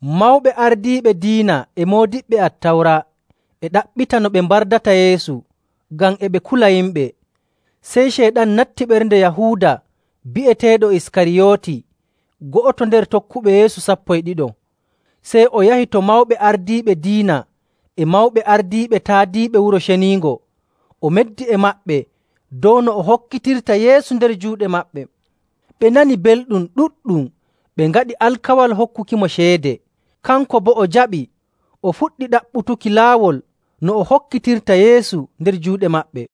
Mawɓe ardiiɓe diina e moodiɓɓe Attawra e ɗaɓɓita no ɓe mbardata Yeesu, ngam e ɓe kula yimɓe. Sey Ceyɗan natti ɓernde Yahuuda bi'eteeɗo Iskariyooti, go'oto nder tokkuɓe Yeesu sappo e ɗiɗo. Sey o yahi to mawɓe ardiiɓe diina e mawɓe ardiiɓe taadiiɓe Wuro Ceniingo, o meddi e maɓɓe dow no o hokkitirta Yeesu nder juuɗe maɓɓe. Ɓe nani belɗum ɗuɗɗum, ɓe ngaɗi alkawal hokkukimo ceede. Kanko boo o jaɓi, o fuɗɗi ɗaɓɓutuki laawol no o hokkitirta Yeesu nder juuɗe maɓɓe.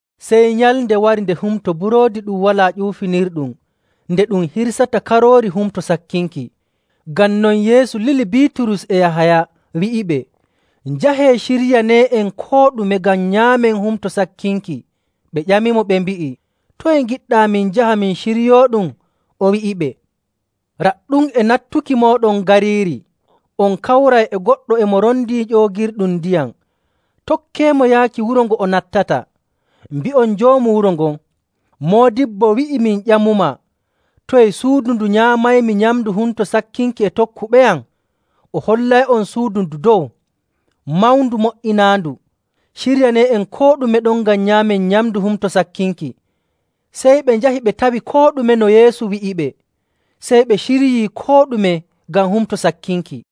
Sey nyalnde wari nde Humto Buroodi Ɗum Walaa Ƴuufinirɗum nde ɗum hirsata karoori Humto Sakkinki. Ngam non Yeesu lili Biiturus e Yahaya wi'iɓe, “Njahee ciryanee'en koo ɗume ngam nyaamen Humto Sakkinki.” Ɓe ƴamimo ɓe mbi'i, “Toye ngiɗɗaa min njaha min ciryooɗum?” O wi'iɓe, “Raɗɗum, e nattuki mooɗon gariiri, on kawray e goɗɗo e mo rondii ƴoogirde ndiyam. Tokkeemo yaaki wuro ngo o nattata, mbi'on joomu wuro ngon, ‘Moodibbo wi'ii min ƴamumaa: “Toye suudu ndu nyaamaymi nyamndu Humto Sakkinki e tokkuɓeyam?” ’ O hollay'on suudu ndu dow, mawndu mo''inaandu. Ciryanee'en koo ɗume ɗon ngam nyaamen nyamndu Humto Sakkinki.” Sey ɓe njahi ɓe tawi koo ɗume no Yeesu wi'iɓe, sey ɓe ciryii koo ɗume ngam Humto Sakkinki.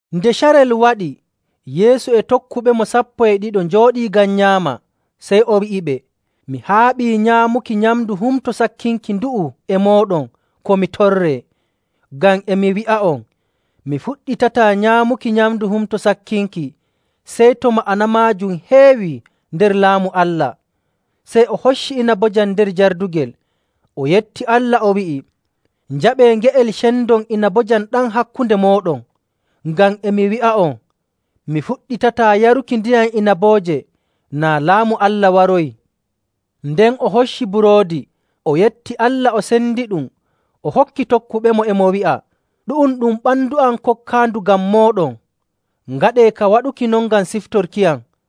Nde carel waɗi, Yeesu e tokkuɓemo sappo e ɗiɗo njooɗii ngam nyaama. Sey o wi'iɓe, “Mi haaɓii nyamduki nyamndu Humto Sakkinki ndu'u e mooɗon ko mi torree. Ngam e mi wi'a'on, mi fuɗɗitataa nyaamuki nyamndu Humto Sakkinki sey to ma'ana maajum heewii nder Laamu Allah.” Sey o hocci inabojam nder jardugel, o yetti Allah, o wi'i, “Njaɓee nge'el cendon inabojam ɗam hakkunde mooɗon. Ngam e mi wi'a'on, mi fuɗɗitataa yaruki ndiyam inabooje naa Laamu Allah waroyii.” Nden o hocci buroodi, o yetti Allah, o sendiɗum, o hokki tokkuɓemo, e mo wi'a, “Ɗu'um ɗum ɓandu am, kokkaandu ngam mooɗon. Ngaɗee ka waɗuki non ngam siftorkiyam.”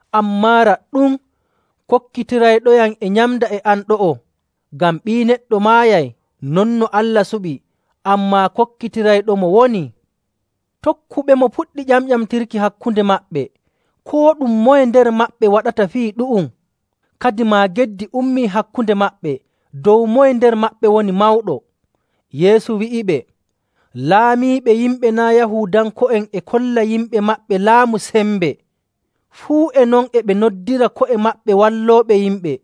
“Ammaa, raɗɗum, kokkitirayɗoyam e nyamda e am ɗo'o.. Ngam Ɓii Neɗɗo maayay non no Allah suɓi, ammaa kokkitirayɗomo wonii!” Tokkuɓemo puɗɗi ƴamƴamtirki hakkunde maɓɓe, koo ɗum moye nder maɓɓe waɗata fii ɗu'um. Kadimaa geddi ummii hakkunde maɓɓe dow moye nder maɓɓe woni mawɗo.. Yeesu wi'iɓe, “Laamiiɓe yimɓe naa' Yahuudanko'en e kolla yimɓe maɓɓe laamu sembe, fuu e non e ɓe noddira ko'e maɓɓe wallooɓe yimɓe.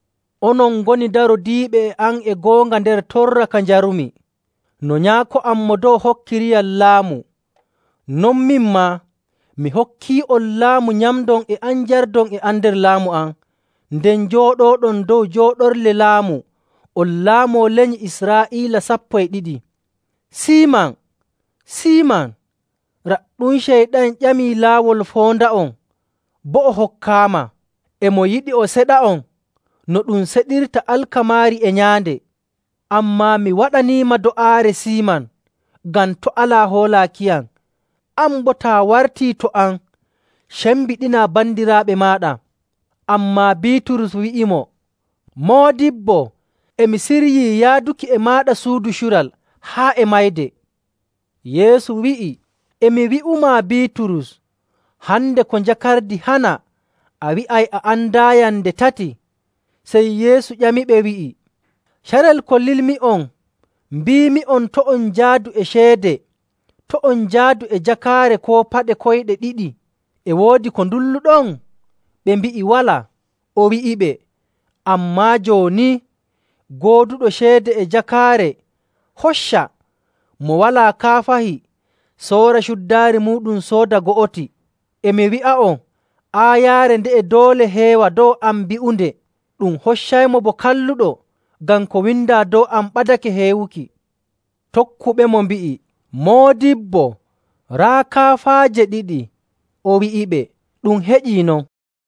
“Onon ngoni darodiiɓe e am e goonga nder torra ka njarumi. No Nyaako am Mo Dow hokkiriyam laamu, non min maa, mi hokkii'on laamu nyamdon e am njardon e am nder laamu am, nden njooɗooɗon dow jooɗorle laamu, on laamoo lenyi Israa'iila sappo e ɗiɗi.. “Siiman, Siiman, raɗɗum Ceyɗan ƴamii laawol foonda'on, boo o hokkaama. E mo yiɗi o seɗa'on no ɗum seɗirta alkamaari e nyaande. Ammaa mi waɗaniima do'aare, Siiman, ngam to' alaa hoolaakiyam. An boo, taa wartii to am, cembiɗinaa bandiraaɓe maaɗa.” Ammaa Biiturus wi'imo, “Moodibbo, e mi siryii yaaduki e maaɗa suudu cural, haa e mayde.” Yeesu wi'i, “E mi wi'umaa, Biiturus, hande ko njakardi hana, a wi'ay a andaayam nde tati.” Sey Yeesu ƴamiɓe wi'i, “Carel ko lilmi'on mbiimi'on to' on njaadu e ceede, to' on njaadu e jakaare koo paɗe koyɗe ɗiɗi, e woodi ko ndulluɗon?” Ɓe mbi'i, “Walaa.”. O wi'iɓe, “Ammaa jooni, gooduɗo ceede e jakaare, hocca. Mo walaa kaafahi, soora cuddaari muuɗum sooda go'oti. E mi wi'a'on, aayaare nde'e doole heewa dow am bi'unde, ‘Ɗum hoccaymo bo kalluɗo,’ ngam ko windaa dow am ɓadake heewuki.”. Tokkuɓemo mbi'i, “Moodibbo, raa kaafaaje ɗiɗi.” O wi'iɓe, “Ɗum heƴii non.”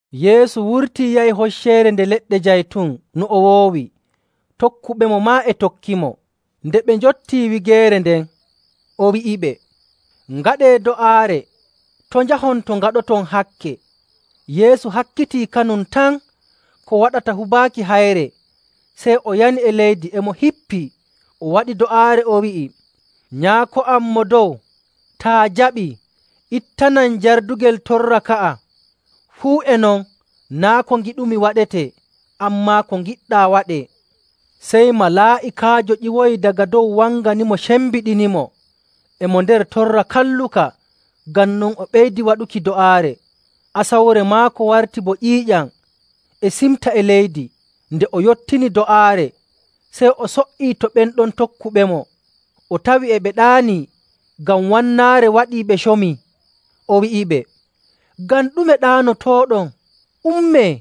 Yeesu wurtii, yahi Hocceere Nde Leɗɗe Jaytun no o woowi, tokkuɓemo maa e tokkimo. Nde ɓe njottii wigeere nden, o wi'iɓe, “Ngaɗee do'aare to' njahon to ngaɗoton hakke.” Yeesu hakkitii kanum tan ko waɗata hubaaki hayre, sey o yani e leydi e mo hippii, o waɗi do'aare, o wi'i, “Nyaako am Mo Dow, taa jaɓii, ittanam jardugel torra ka'a. Fuu e non, naa' ko ngiɗumi waɗetee, ammaa ko ngiɗɗaa waɗee.” Sey malaa'ikaajo ƴiwoyi daga dow wanganimo sembiɗinimo. E mo nder torra kalluka, ngam non o ɓeydi waɗuki do'aare. Asawre maako warti bo ƴiiƴam e simta e leydi. Nde o yottini do'aare, sey o so''ii to ɓen ɗon tokkuɓemo, o tawi e ɓe ɗaanii ngam wannaare: Waato ɓillaare. waɗi ɓe comii. O wi'iɓe, “Ngam ɗume ɗaanotooɗon? Ummee,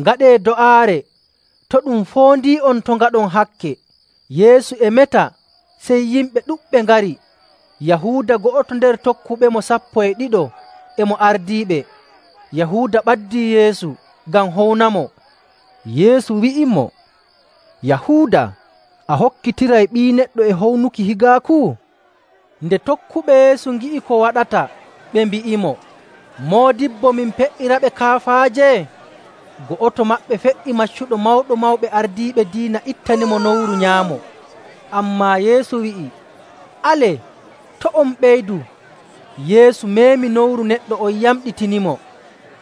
ngaɗee do'aare to ɗum foondii'on to' ngaɗon hakke.” Yeesu e meta, sey yimɓe ɗuɗɓe ngari. Yahuuda, go'oto nder tokkuɓemo sappo e ɗiɗo e mo ardiiɓe. Yahuuda ɓaddii Yeesu ngam hownamo. Yeesu wi'imo, “Yahuuda, a hokkitiray Ɓii Neɗɗo e hownuki higaaku?” Nde tokkuɓe Yeesu ngi'i ko waɗata, ɓe mbi'imo, “Moodibbo, min pe''iraɓe kaafaaje?” Go'oto maɓɓe fe''i maccuɗo Mawɗo Mawɓe Ardiiɓe Diina ittanimo nowru nyaamo. Ammaa Yeesu wi'i, “Alee! To' on ɓeydu!” Yeesu meemi nowru neɗɗo on, yamɗitinimo.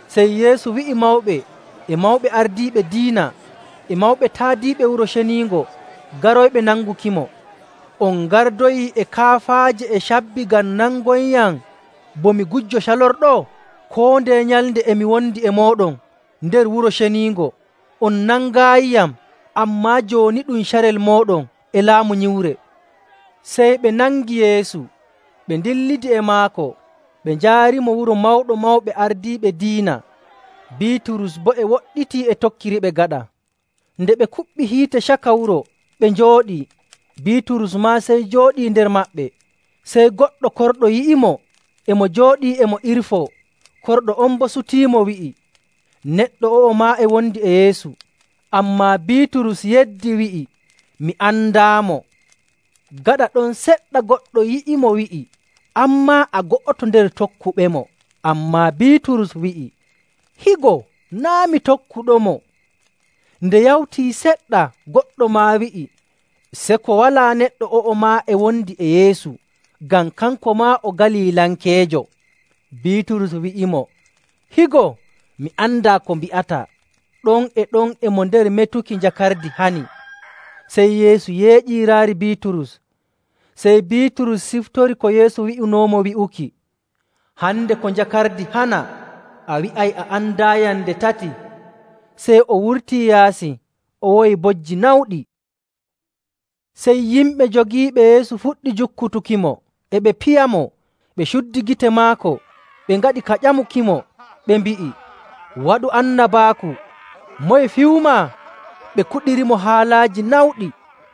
Sey Yeesu wi'i mawɓe, e mawɓe ardiiɓe diina, e mawɓe taadiiɓe Wuro Ceniingo garoyɓe nangukimo, “On ngardoyi e kaafaaje e cabbi ngam nangoyyam bo mi gujjo calorɗo? Koo ndeye nyalnde e mi wondi e mooɗon nder Wuro Ceniingo, on nangaayiyam. Ammaa jooni ɗum carel mooɗon, e laamu nyiwre.”. Sey ɓe nangi Yeesu, ɓe ndillidi e maako, ɓe njaarimo wuro Mawɗo Mawɓe Ardiiɓe Diina. Biiturus boo e woɗɗiti e tokkiriɓe gaɗa. Nden ɓe kuɓɓi hiite caka wuro, ɓe njooɗii, Biiturus maa sey jooɗii nder maɓɓe. Sey goɗɗo korɗo yi'imo e mo jooɗii e mo irfoo. Korɗo on boo sutiimo wi'i, “Neɗɗo o'o maa e wondi e Yeesu.” Ammaa Biiturus yeddi, wi'i, “Mi andaamo.” Gaɗa ɗon seɗɗa goɗɗo yi'imo wi'i, “An maa, a go'oto nder tokkuɓemo.” Ammaa Biiturus wi'i, “Higo, naa' mi tokkuɗomo!” Nde yawtii seɗɗa, goɗɗo maa wi'i, “Seko walaa neɗɗo o'o maa e wondi e Yeesu, ngam kanko maa o Galilankeejo.” Biiturus wi'imo, “Higo, mi andaa ko mbi'ataa!” Ɗon e ɗon e mo nder metuki, njakardi hani. Sey Yeesu yeeƴii raari Biiturus. Sey Biiturus siftori ko Yeesu wi'unoomo wi'uki, “Hande ko njakardi hana, a wi'ay a andaayam nde tati.” Sey o wurtii yaasi o woyi bojji nawɗi. Sey yimɓe jogiiɓe Yeesu fuɗɗi jukkutukimo, e ɓe piyamo. Ɓe cuddi gite maako ɓe ngaɗi ka ƴamukimo ɓe mbi'i, “Waɗu annabaaku! Moye fiyumaa?” Ɓe kuɗirimo haalaaji nawɗi.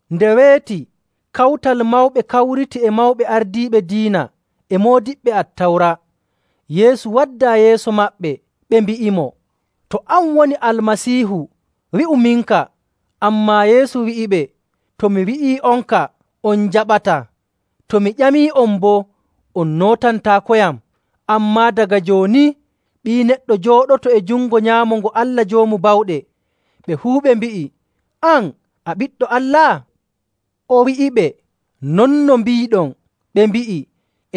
Nde weeti, Kawtal Mawɓe kawriti e mawɓe ardiiɓe diina e moodiɓɓe Attawra. Yeesu waddaa yeeso maɓɓe. Ɓe mbi'imo, “To an woni Almasiihu, wi'uminka.” Ammaa Yeesu wi'iɓe, “To mi wi'ii'onka, on njaɓataa. To mi ƴamii'on boo, on nootantaakoyam. Ammaa daga jooni, Ɓii Neɗɗo jooɗoto e jungo nyaamo ngo Allah Joomu Bawɗe.” Ɓe fuu ɓe mbi'i, “An, a Ɓiɗɗo Allah?” O wi'iɓe, “Non no mbiiɗon.” Ɓe mbi'i,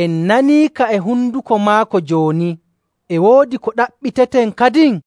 “En naniika e honduko maako jooni. E woodi ko ɗaɓɓiteten kadin?”